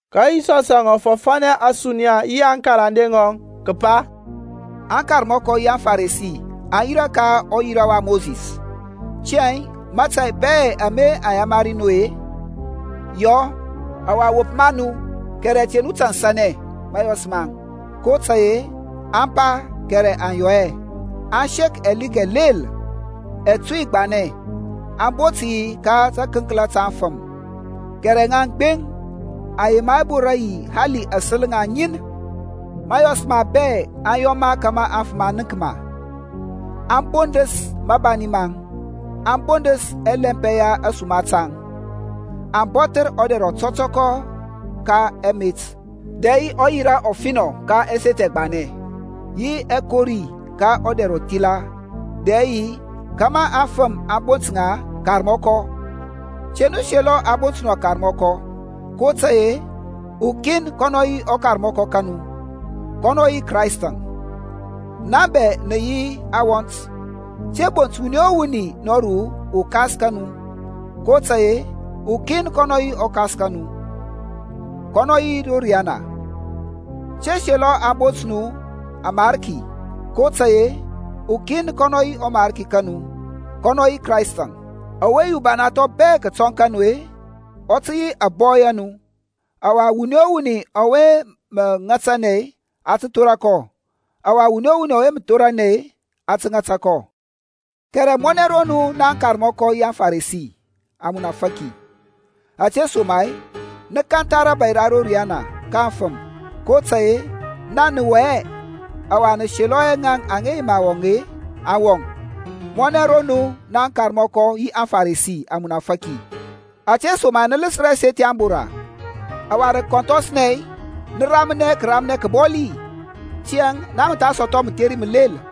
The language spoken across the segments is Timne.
Ka Yisɔsȧŋ ɔ fɔfȧnɛ ȧsuniya yi aŋkarande ŋɔŋ, kǝpa, Aŋkarmɔkɔ yi aŋFarisi aŋ yirȧ ka ɔyira wa Mosis. Tiyȧŋ mȧtȧy bɛ ama aŋ yamari nu-e, yɔ, ɔwa wop ma nu. Kɛrɛ te nu tansanɛ mȧyɔs maŋ, kotȧy-e aŋ pa kɛrɛ aŋ yɔ hɛ. Aŋ sek ɛlik ɛlel ɛtuy gbanɛ, aŋ bot yi ka tȧkǝnkla ta aŋfǝm, kɛrɛ ŋaŋ ŋanɛ aŋ yema hɛ borȧ yi hali yi ȧsel ŋaŋ ŋin. Mȧyɔs maŋ bɛ aŋ yɔ ma kȧmȧ afǝm aŋ nənk ma. Aŋ bondǝs mȧbani maŋ, aŋ bondǝs ɛlɛmpɛ ya ȧsuma taŋ. Aŋ bɔthǝr ɔdɛr ɔtɔtɔkɔ ka ɛmet, dɛ yi ɔyira ɔfinɔ ka ɛseth ɛgbanɛ, yi ɛkori ka ɔdɛr ɔthila dɛ yi kȧmȧ aŋfǝm aŋ bont ŋa Karmɔkɔ. Te nu selɔ a bont nu Karmɔkɔ, kotȧy-e ukin kɔnɔ yi ɔkarmɔkɔ ka nu, kɔnɔ yi Kraistȧŋ. Na bɛ nǝ yi awɔnt. Te bont wuni o wuni nɔru ukas ka nu, kotȧy-e ukin kɔnɔ yi ɔKas ka nu, kɔnɔ yi ro riyana. Te selɔ a bont nu amarki kotȧy-e ukin kɔnɔ yi ɔMarki ka nu, kɔnɔ yi Kraistȧŋ. Ɔwe yi ubana thɔŋ bɛ kǝtɔŋ ka nu-e, ɔ tǝ yi ȧbɔy a nu. Ɔwa wuni o wuni ɔwe mǝ ŋatanɛ, a tǝ thora kɔ, ɔwa wuni o wuni ɔwe mǝ thoranɛ, a tǝ ŋata kɔ. Kɛrɛ mɔnɛ ro nu naŋ akarmɔkɔ yi aFaresi, amunafaki! Ȧtesoma-e nǝ kantha rȧbȧy ra ro riyana ka aŋfǝm. Kotȧy-e naŋ nǝ wɔŋ hɛ, ɔwa nǝ selɔ hɛ ŋaŋ aŋa yema tǝ kǝwɔŋ, aŋ wɔŋ. Mɔnɛ ro nu naŋ akarmɔkɔ yi aFaresi, amunafaki! Ȧtesoma-e nǝ lǝsǝr ɛseth ya ȧŋbora, ɔwa rǝ kǝkɔnthɔsnɛ nǝ ramnɛ kǝramnɛ kǝbɔli. Tiyȧŋ na mǝ tha sɔthɔ mǝtheri mǝlel.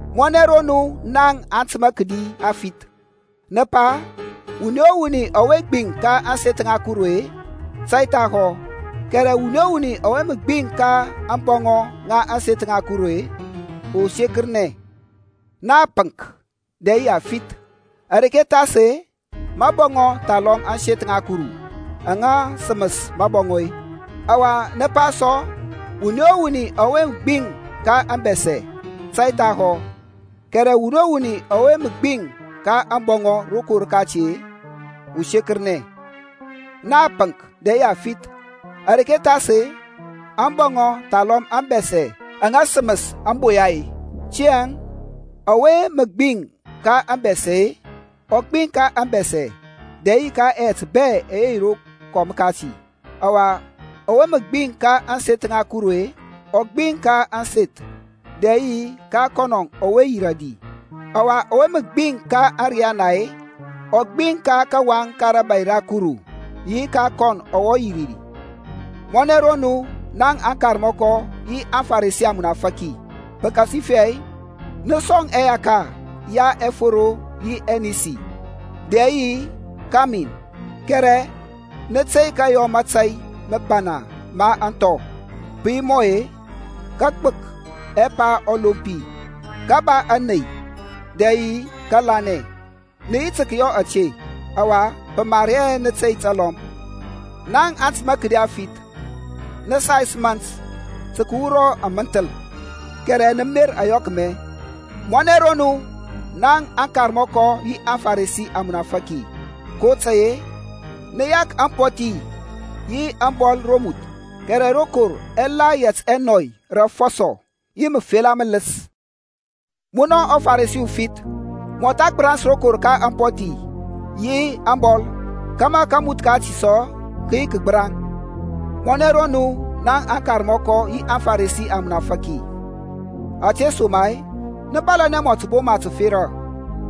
Mɔnɛ ro nu naŋ atǝmȧ kǝdi aŋfith! Nǝ pa, Wuni o wuni ɔwe gbiŋ ka ȧŋseth ŋa Kuru-e, tȧy thahɔ, kɛrɛ wuni o wuni ɔwe mǝ gbiŋ ka mabɔŋɔ ma ȧŋseth ŋa Kuru-e, ɔ sekǝrnɛ. Na apǝŋk dɛ yi afith. Areke thas-e, mabɔŋɔ thalɔm ȧŋseth ŋa Kuru aŋa sǝmǝs mȧbɔŋɔ-e? Ɔwa nǝ pa sɔ, Wuni o wuni ɔwe mǝ gbiŋ ka ȧŋbɛsɛ, tȧy thahɔ, kɛrɛ wuni o wuni ɔwe mǝ gbiŋ ka ȧŋboya rokɔm kati-e, ɔ sekǝrnɛ. Na apǝŋk dɛ yi afith. Areke thas-e, ȧŋboya thalɔm ȧŋbɛsɛ aŋa sǝmǝs ȧŋboya-e? Tiyȧŋ, ɔwe mǝ gbiŋ ka ȧŋbɛsɛ-e, ɔ gbiŋ ka ȧŋbɛsɛ dɛ yi ka ɛyɛt bɛ ɛyɛ yi rokɔm kati. Ɔwa ɔwe mǝ gbiŋ ka ȧŋseth ŋa Kuru-e, ɔ gbiŋ ka ȧŋseth dɛ yi ka kɔnɔ ɔwe yirȧ ri. Ɔwa ɔwe mǝ gbiŋ ka ȧriyana-e, ɔ gbiŋ ka kawaŋ ka rȧbȧy ra Kuru, yi ka kɔnɔ ɔwe yirȧ ri. Mɔnɛ ro nu, naŋ akarmɔkɔ yi aFaresi, amunafaki! Pǝkasifɛ nǝ sɔŋ ɛyaka ya ɛsoro yi anisi, dɛ yi kamin, kɛrɛ nǝ tey kǝyɔ mȧtȧy mǝbana ma aŋthɔ, pǝ yi mɔ-e kǝgbǝk ɛpa ɔlompi, kǝba ȧney dɛ yi kǝlanɛ. Nǝ yi tǝ kǝyɔ ȧte, ɔwa pǝ mar hɛ nǝ tey talɔm. Naŋ atǝmȧ kǝdi afith, nǝ sais mȧnt tǝ kǝwura amǝnthǝl, kɛrɛ nǝ mer ȧyɔkmɛ. Mɔnɛ ro nu, naŋ akarmɔkɔ yi aFaresi, amunafaki! kotȧy-e nǝ yak ampɔthi yi ȧŋbɔl romuth, kɛrɛ rokor ɛ la yɛt ɛnɔy rȧ ȧfɔsɔ yi mǝfela mǝlǝs. Munɔ ɔFaresi ufith, mɔtha gbǝrans rokor ka ampɔthi yi ȧŋbɔl, kȧmȧ kamuth kati sɔ kǝ yi kǝgbǝraŋ. Mɔnɛ ro nu, naŋ akarmɔkɔ yi aFaresi, amunafaki! Ȧtesoma-e nǝ bȧlȧnɛ mɔ tǝboma tǝfera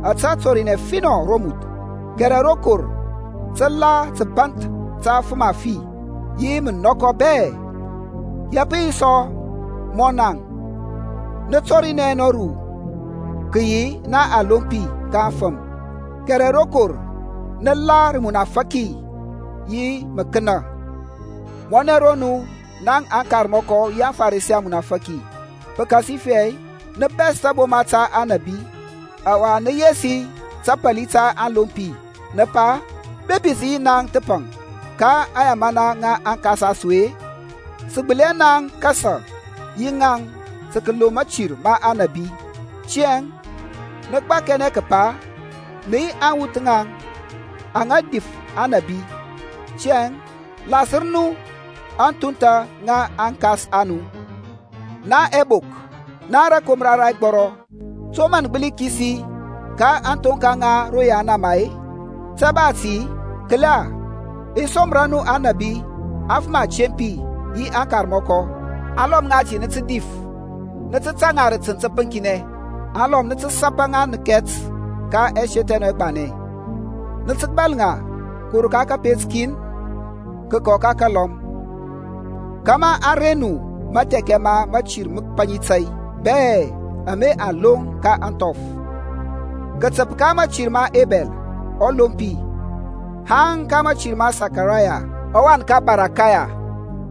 ȧte tɔrinɛ ɔfinɔ romuth, kɛrɛ rokor tǝ la tǝbanth ta afǝm afi, yi mǝnɔkɔ bɛ. Ya pǝ yi sɔ mɔ naŋ, nǝ tɔrinɛ nɔru kǝyi na alompi ka aŋfǝm, kɛrɛ rokor nǝ la rǝmunafaki yi mǝkǝnȧ. Mɔnɛ ro nu, naŋ akarmɔkɔ yi aFaresi, amunafaki! Pǝkasifɛ nǝ bɛs taboma ta aŋnabi, ɔwa nǝ yesi tapali ta aŋlompi, nǝ pa, Bepi sǝ yi naŋ thǝpaŋ ka aŋyamana ŋa aŋkas a su-e, sǝ gbǝli hɛ naŋ kasa yi ŋaŋ tǝ kǝloŋ mȧtir ma aŋnabi. Tiyȧŋ nǝ gbakɛnɛ kǝpa nǝ yi awuth ŋa ŋaŋ aŋa difǝth Aŋnȧbi. Tiyȧŋ, lasǝr nu aŋthuntha ŋa aŋkas a nu. Naŋ ɛbok, naŋ rǝkomra ra ɛgbɔrɔ, to mǝ nǝ gbǝli kisi ka aŋthoŋka ŋa ro yahanama-e? Te ba ti, kǝla, i somra nu anȧbi, afǝm atempi yi akarmɔkɔ; alɔm ŋati nǝ tǝ dif, nǝ tǝ tȧŋ ŋa rǝ tǝnt tǝpǝŋkinɛ, alɔm nǝ tǝ sapa ŋa nǝkɛt ka ɛseth ɛ nu ɛgbanɛ, nǝ tǝ bȧl ŋa kǝwur ka kǝpet kin kǝkɔ ka kǝlɔm, kȧmȧ a reŋ nu mathɛkɛ ma mȧtir mǝpaŋi tȧy bɛ ama a loŋ ka ȧŋthɔf kǝtǝp ka mȧtir ma Ebɛl ɔlompi haŋ ka mȧtir ma Sakaraya ɔwan ka Barakaya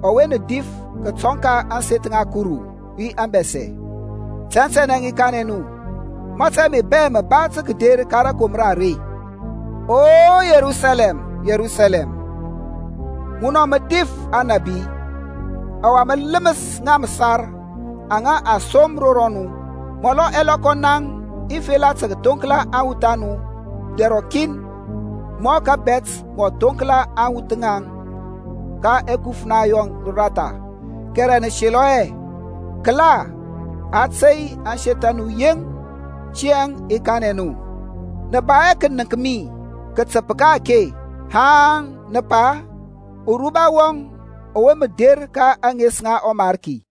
ɔwe nǝ dif kǝtɔŋ ka ȧŋseth ŋa Kuru yi ȧŋbɛsɛ. Tɛntɛnɛ i kanɛ nu, mȧtȧy ame bɛ mǝ ba tǝ kǝder ka rȧkomra are. O Yerusalɛm, Yerusalɛm, munɔ mǝ difǝth aŋnabi, ɔwa mǝ lǝmǝs ŋa mǝsar aŋa a som ro mu, amɔlɔ ɛlɔkɔ naŋ i fela tǝ kǝthoŋkla aŋwuth a mu dɛr rɔkin, mɔ kȧbɛt mɔ thonkla aŋwuth ŋɔŋ ka ɛkufna yɔŋ ratha, kɛrɛ mǝ selɔ hɛ. Kǝla, a tey ȧŋseth a mu yeŋ. Tiyȧŋ i kanɛ nu, nǝ ba hɛ kǝnǝŋk mi kǝtǝp ka-ake haŋ nǝ pa, Uruba wɔŋ ɔwe mǝ der ka ȧŋes ŋa ɔMarki.